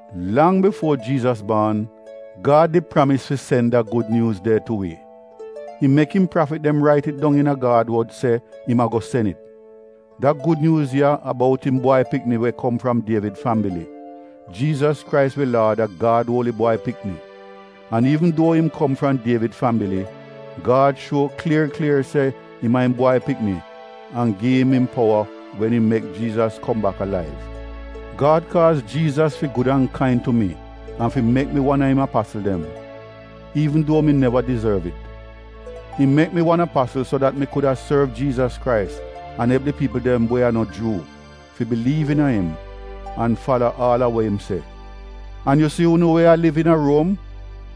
Lang bifuo Jiizas baan, Gad did pramis fi sen da Gud Nyuuz de tu wi. Im mek im prafit dem rait it dong iina Gad wod se im ago sen it. Da Gud Nyuuz ya a bout im Bwai Pikni we kom fram Dievid fambili. Jiizas Krais wi Laad a Gad Uoli Bwai Pikni. An iivn duo im kom fram Dievid fambili, Gad shuo klier klier se im a im Bwai Pikni an gi im im powa wen im mek Jiizas kom bak alaiv. Gad kaaz Jiizas fi gud an kain tu mi an fi mek mi wan a im apasl dem, iivn duo mi neva dizorv it. Im mek mi wan apasl so dat mi kuda sorv Jiizas Krais an elp di piipl dem we a no Juu fi biliiv iina im an fala aal a wa im se. An yu si unu we a liv iina Ruom,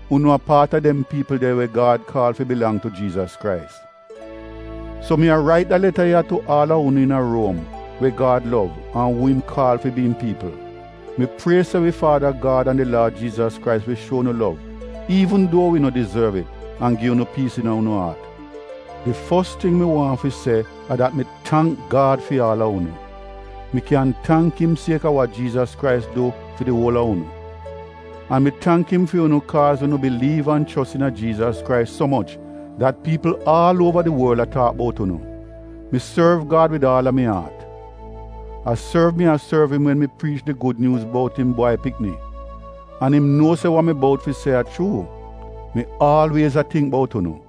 unu a paat a dem piipl de we Gad kaal fi bilang tu Jiizas Krais. So mi a rait da leta ya tu aal a unu iina Ruom we Gad lov an uu im kaal fi bi im piipl. Mi prie se wi Faada Gad an di Laad Jiizas Krais wi shuo unu lov iivn duo wi no dizorv it an gi unu piis iina unu aat. Di fos ting mi waahn fi se a dat mi tangk Gad fi aal a unu. Mi kyan tangk im sieka wa Jiizas Krais du fi di uol a unu. An mi tangk im fi unu kaaz unu biliiv an chos iina Jiizas Krais so moch dat piipl aal uova di worl a taak bout unu. Mi sorv Gad wid aal a mi aat. A sorv mi a sorv im wen mi priich di Gud Nyuuz bout im Bwai Pikni, an im nuo se wa mi bout fi se a chuu: Mi aalwiez a tingk bout unu.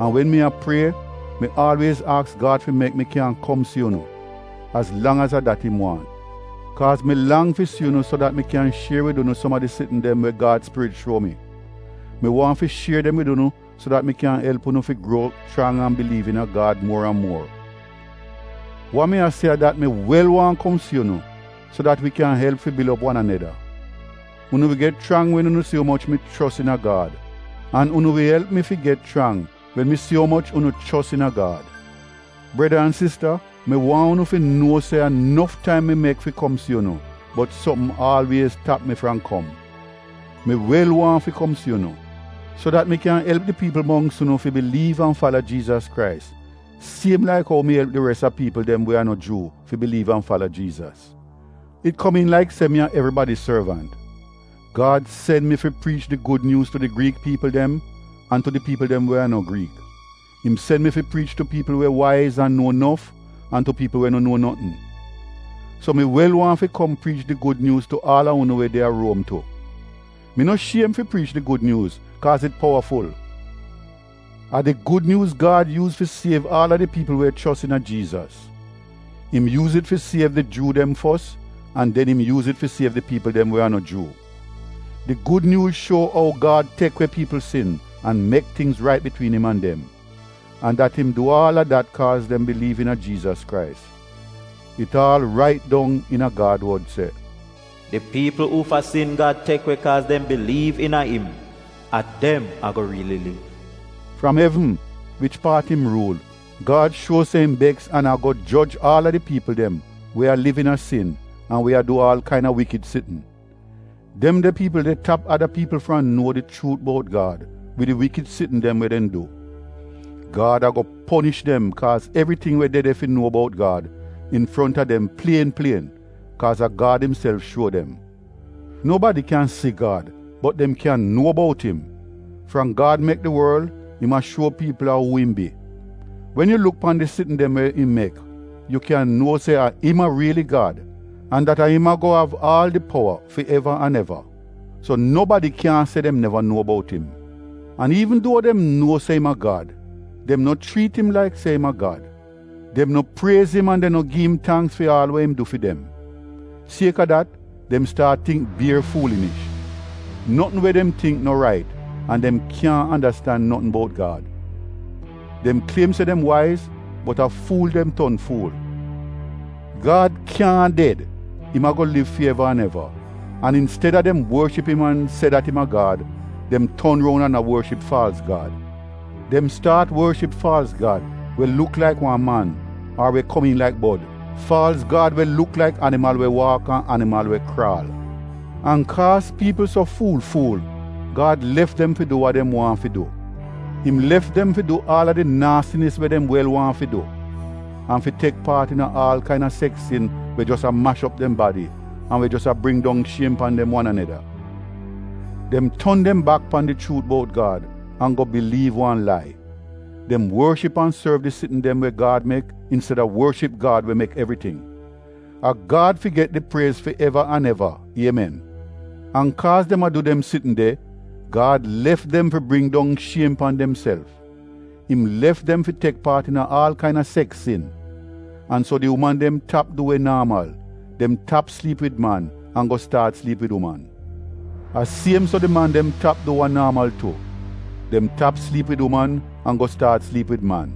An wen mi a prie, mi aalwiez aks Gad fi mek mi kyan kom si unu, az lang az a dat im waahn. Kaaz mi lang fi si unu so dat mi kyan shier wid unu som a di sitn dem we Gad spirit shuo mi. Mi waahn fi shier dem wid unu so dat mi kyan elp unu fi gruo chrang an biliiv iina Gad muor an muor. Wa mi a se a dat mi wel waahn kom si unu so dat wi kyan elp fi bil op wi wan aneda. Unu wi get chrang wen unu si umoch mi chos iina Gad, an unu wi elp mi fi get chrang wen mi si umoch unu chos iina Gad. Breda an sista mi waahn unu fi nuo se a nof taim mi mek fi kom si unu bot sopm aalwiez tap mi fram kom. Mi wel waahn fi kom si unu, so dat mi kyan elp di piipl mongks unu fi biliiv an fala Jiizas Krais siem laik ou mi elp di res a piipl dem we a no Juu fi biliiv an fala Jiizas. It komiin laik se mi a evribadi sorvant. Gad sen mi fi priich di Gud Nyuuz tu di Griik piipl dem an tu di piipl dem we a no Griik. Im sen mi fi priich tu piipl we waiz an nuo nof, an tu piipl we no nuo notn. So mi wel waahn fi kom priich di Gud Nyuuz tu aal a unu we de a Ruom tu. Mi no shiem fi priich di Gud Nyuuz kaaz it powaful. A di Gud Nyuuz Gad yuuz fi siev aal a di piipl we chos iina Jiizas. Im yuuz it fi siev di Juu dem fos an den im yuuz it fi siev di piipl dem we a no Juu. Di Gud Nyuuz shuo ou Gad tek we piipl sin an mek tingz rait bitwiin im an dem, an dat im du aal a dat kaaz dem biliiv iina Jiizas Krais. It aal rait dong iina Gad wod se, “Di piipl uufa sin Gad tek we kaaz dem biliiv iina im, a dem ago riili liv.” Fram evn, wich paat im ruul, Gad shuo se im beks an ago joj aal a di piipl dem we a liv iina sin an we a du aal kaina wikid sitn. Dem de piipl de tap ada piipl fram nuo di chuut bout Gad wid di wikid sitn dem we dem du. Gad ago ponish dem kaaz evriting we de de fi nuo bout Gad infronta dem plien plien, kaaz a Gad imself shuo dem. Nobadi kyan si Gad bot dem kyan nuo bout im. Fram Gad mek di worl, im a shuo piipl a uu im bi. Wen yu luk pan di sitn dem we im mek, yu kyan nuo se a im a riili Gad an dat a im ago av aal di powa fi eva an eva. So nobadi kyaahn se dem neva nuo bout im. An iivn duo dem nuo se im a Gad, dem no chriit im laik se im a Gad. Dem no priez im an dem no gi im tangks fi aal we im du fi dem. Sieka dat dem staat tingk bier fuulinish, notn we dem tingk no rait an dem kyaahn andastan notn bout Gad. Dem kliem se dem waiz bot a fuul dem ton fuul. Gad kyaahn ded, im ago liv fi eva an eva, an insteda dem worship im an se dat im a Gad, dem ton roun an a worship faalz gad. Dem staat worship faalz gad we luk laik wan man ar we komiin laik bod, faalz gad we luk laik animal we waak an animal we kraal. An kaaz piipl so fuul-fuul, Gad lef dem fi du wa dem waahn fi du. Im lef dem fi du aal a di naasinis we dem wel waahn fi du, an fi tek paat iina aal kain seks sin we jos a mash op dem badi an we jos a bring dong shiem pan dem wan aneda. Dem ton dem bak pan di chuut bout Gad an go biliiv wan lai. Dem worship an sorv di sitn dem we Gad mek insteda worship Gad we mek evriting. A Gad fi get di priez fi eva an eva. Iemen! An kaaz dem a du dem sitn de, Gad lef dem fi bring don shiem pan demself. Im lef dem fi tek paat iina aal kaina seks sin. An so di uman dem tap du we naamal — dem tap sliip wid man an go staat sliip wid uman. A siem so di man dem tap du wa naamal tu — dem tap sliip wid uman an go staat sliip wid man.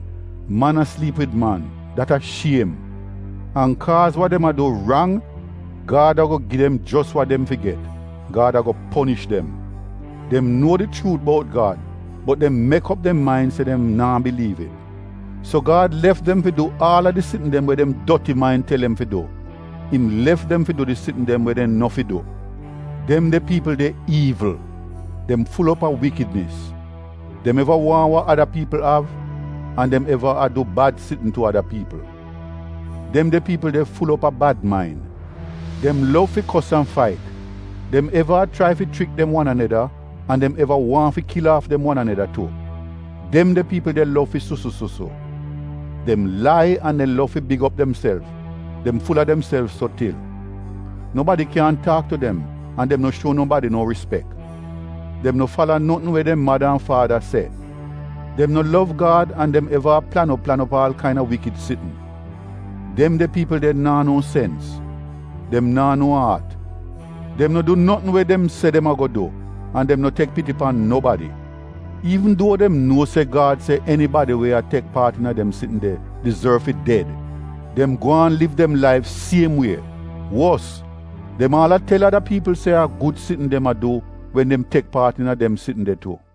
Man a sliip wid man, dat a shiem, an kaaz wa dem a du rang, Gad ago gi dem jos wa dem fi get — Gad ago ponish dem. Dem nuo di chuut bout Gad bot dem mek op dem main se dem naa biliiv it. So Gad lef dem fi du aal a di sitn dem we dem doti main tel dem fi du im lef dem fi du di sitn dem we dem no fi du. Dem de piipl de iivl, dem ful op a wikidnis. Dem eva waahn wa ada piipl av an dem eva a du bad sitn tu ada piipl. Dem de piipl de ful op a bad main. Dem lov fi kos an fait, dem eva a chrai fi chrik dem wan aneda an dem eva waahn fi kil aaf dem wan aneda tu. Dem de piipl de lov fi susu-susu. Dem lai an dem lov fi big op demself — dem ful-a demself so til. Nobadi kyaahn taak tu dem an dem no shuo nobadi no rispek. Dem no fala notn we dem mada an faada se. Dem no lov Gad an dem eva a plan op plan op aal kaina wikid sitn. Dem de piipl de naa no sens, dem naa no aat, dem no du notn we dem se dem ago du an dem no tek piti pan nobadi. Iivn duo dem nuo se Gad se enibadi we a tek paat iina dem sitn de, dizorv fi ded, dem gwaan liv dem laif siem wie. Wos dem aal a tel ada piipl se a gud sitn dem a du wen dem tek paat iina dem sitn de tu.